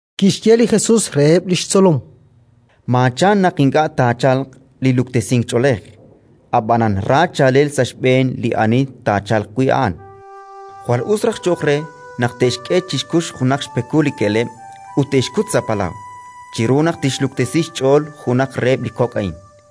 Kixye li Jesus reheb' li xtzolom: “Maachan naq ink'a' taachalq li luktesink ch'oolej, ab'anan ra chaalel sa' xb'een li ani taachalq wi' a'an. Jwal us raj cho'q re naq te'xk'e chi xkux junaq xpekul li ke'leb' ut te'xkut sa' palaw, chiru naq tixluktesi xch'ool junaq reheb' li kok' a'in.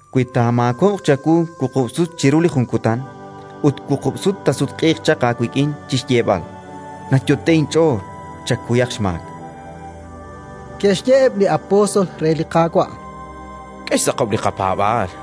Wi taamaakob'q chawu wuqub' sut chiru li jun kutan ut wuqub' sut taasutq'iiq chaq aawik'in chi xyeeb'al: «Nayot'e'k inch'ool», chakuyaq xmaak”. Ke'xye eb' li apóstol re li Qaawa': —K'e xtz'aqob' li qapaab'aal.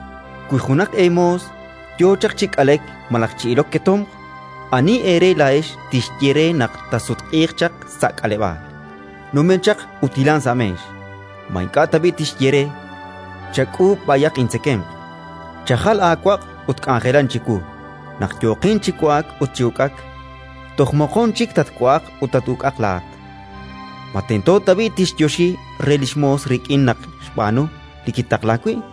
“Wi junaq eemoos yo chaq chi k'alek malaj chi ilok ketomq, ani eere laa'ex tixye re naq taasutq'iiq chaq sa' k'aleb'aal: «Numen chaq ut hilan sa' meex»? Ma ink'a' tab'i' tixye re: «Chak'uub' b'ayaq intzekemq, chajal aawaq' ut k'anjelan chiwu naq yooqin chi wa'ak ut chi uk'ak; toj moqon chik tatwa'aq ut tat-uk'aq laa'at»? Ma tento tab'i' tixyoxi re li xmoos rik'in naq xb'aanu li kitaqlaak wi'?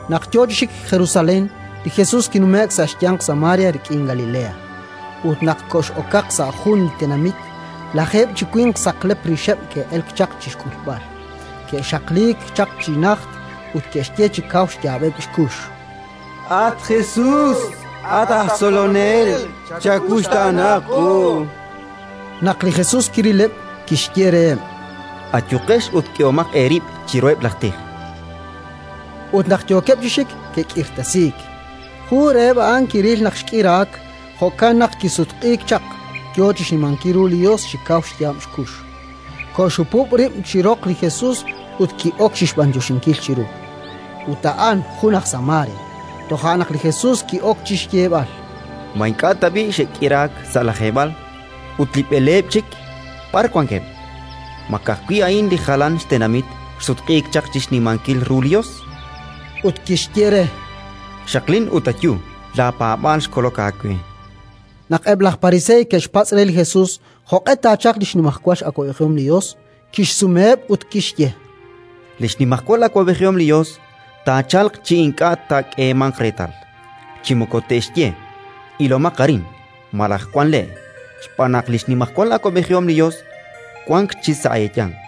Naq yo chi xik Jerusalén, li Jesus kinume'k sa' xyanq Samaria rik'in Galilea. Ut naq kox'okaq sa' jun li tenamit, lajeeb' chi winq saqlep rixeb' ke'elk chaq chi xk'ulb'al; ke'xaqliik chaq chi najt ut ke'xye chi kaw xyaab'eb' xkux: —At Jesus, at aj Tzolonel, chawuxtaana qu! Naq li Jesus kirileb', kixye reheb': —Ayuqex ut k'utomaq eerib' chiruheb' laj tij. Ut naq yookeb' chi xik, ke'k'irtasiik. Jun reheb' a'an kiril naq xk'iraak; jo'kan naq kisutq'iik chaq, yo chi xnimankil ru li Yos chi kaw xyaab' xkux; koxhupub' rib' chi roq li Jesus ut ki'ok chi xb'anyoxinkil chiru. Ut a'an jun aj Samaria. Toja' naq li Jesus ki'ok chi xyeeb'al: —Ma ink'a' tab'i' xe'k'iraak sa' lajeeb'al? Ut li b'eleeb' chik, b'ar wankeb'? Ma ka'ajwi' a'in li jalan xtenamit xsutq'iik chaq chi xnimankil ru li Yos? Ut kixye re: —Xaqlin ut ayu: laapaab'aal xkolok aawe. Naq eb' laj Pariseey ke'xpatz' re li Jesus jo'q'e taachalq li xnimajwal awab'ejihom li Yos, kixsumeheb' ut kixye: —Li xnimajwal awab'ejihom li Yos taachalq chi ink'a' taak'eemanq reetal, chi moko te'xye: «Ilomaq arin» malaj: «Wank le'», xb'aan naq li xnimajwal awab'ejihom li Yos wank chik sa' eeyanq.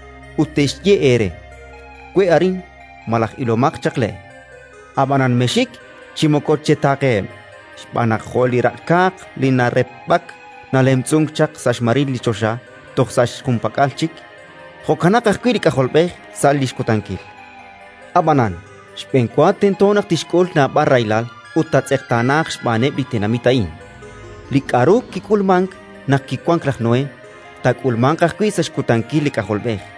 Ut te'xye eere: «We' arin» malaj: «Ilomaq chaq le'», ab'anan mexxik chi moko chetaaqeheb'. Xb'aan naq jo' li raq'kaaq li narepb'ak, nalemtz'unk chaq sa' xmaril li choxa toj sa' li junpak'al chik, jo'kanaq ajwi' li K'ajolb'ej sa' li xkutankil. Ab'anan, xb'enwa tento naq tixk'ul naab'al rahilal ut taatz'eqtaanaaq xb'aaneb' li tenamit a'in. “Li k'aru kik'ulmank naq kiwank laj Noé, taak'ulmanq ajwi' sa' xkutankil li K'ajolb'ej.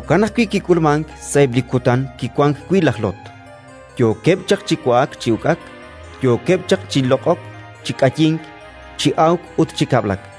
Jo'kan ajwi' kik'ulmank sa'eb' li kutan kiwank wi' laj Lot: yookeb' chaq chi wa'ak chi uk'ak, yookeb' chaq chi loq'ok chi k'ayink, chi awk ut chi kab'lak;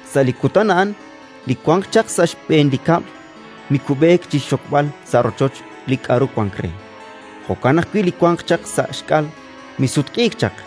“Sa' li kutan a'an li wanq chaq sa' xb'een li kab'l mikub'eek chi xxokb'al sa' rochoch li k'aru wank re; jo'kan ajwi' li wanq chaq sa' xk'al misutq'iik chaq.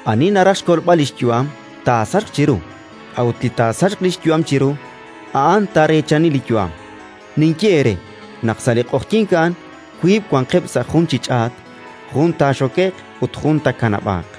Ani naraj xkolb'al li xyu'am, taasachq chiru; a'ut li taasachq li xyu'am chiru, a'an taareechani li yu'am. “Ninye eere naq sa' li q'oqyink a'an wiib' wanqeb' sa' jun chi ch'aat: jun taaxoke'q ut jun taakanab'aaq.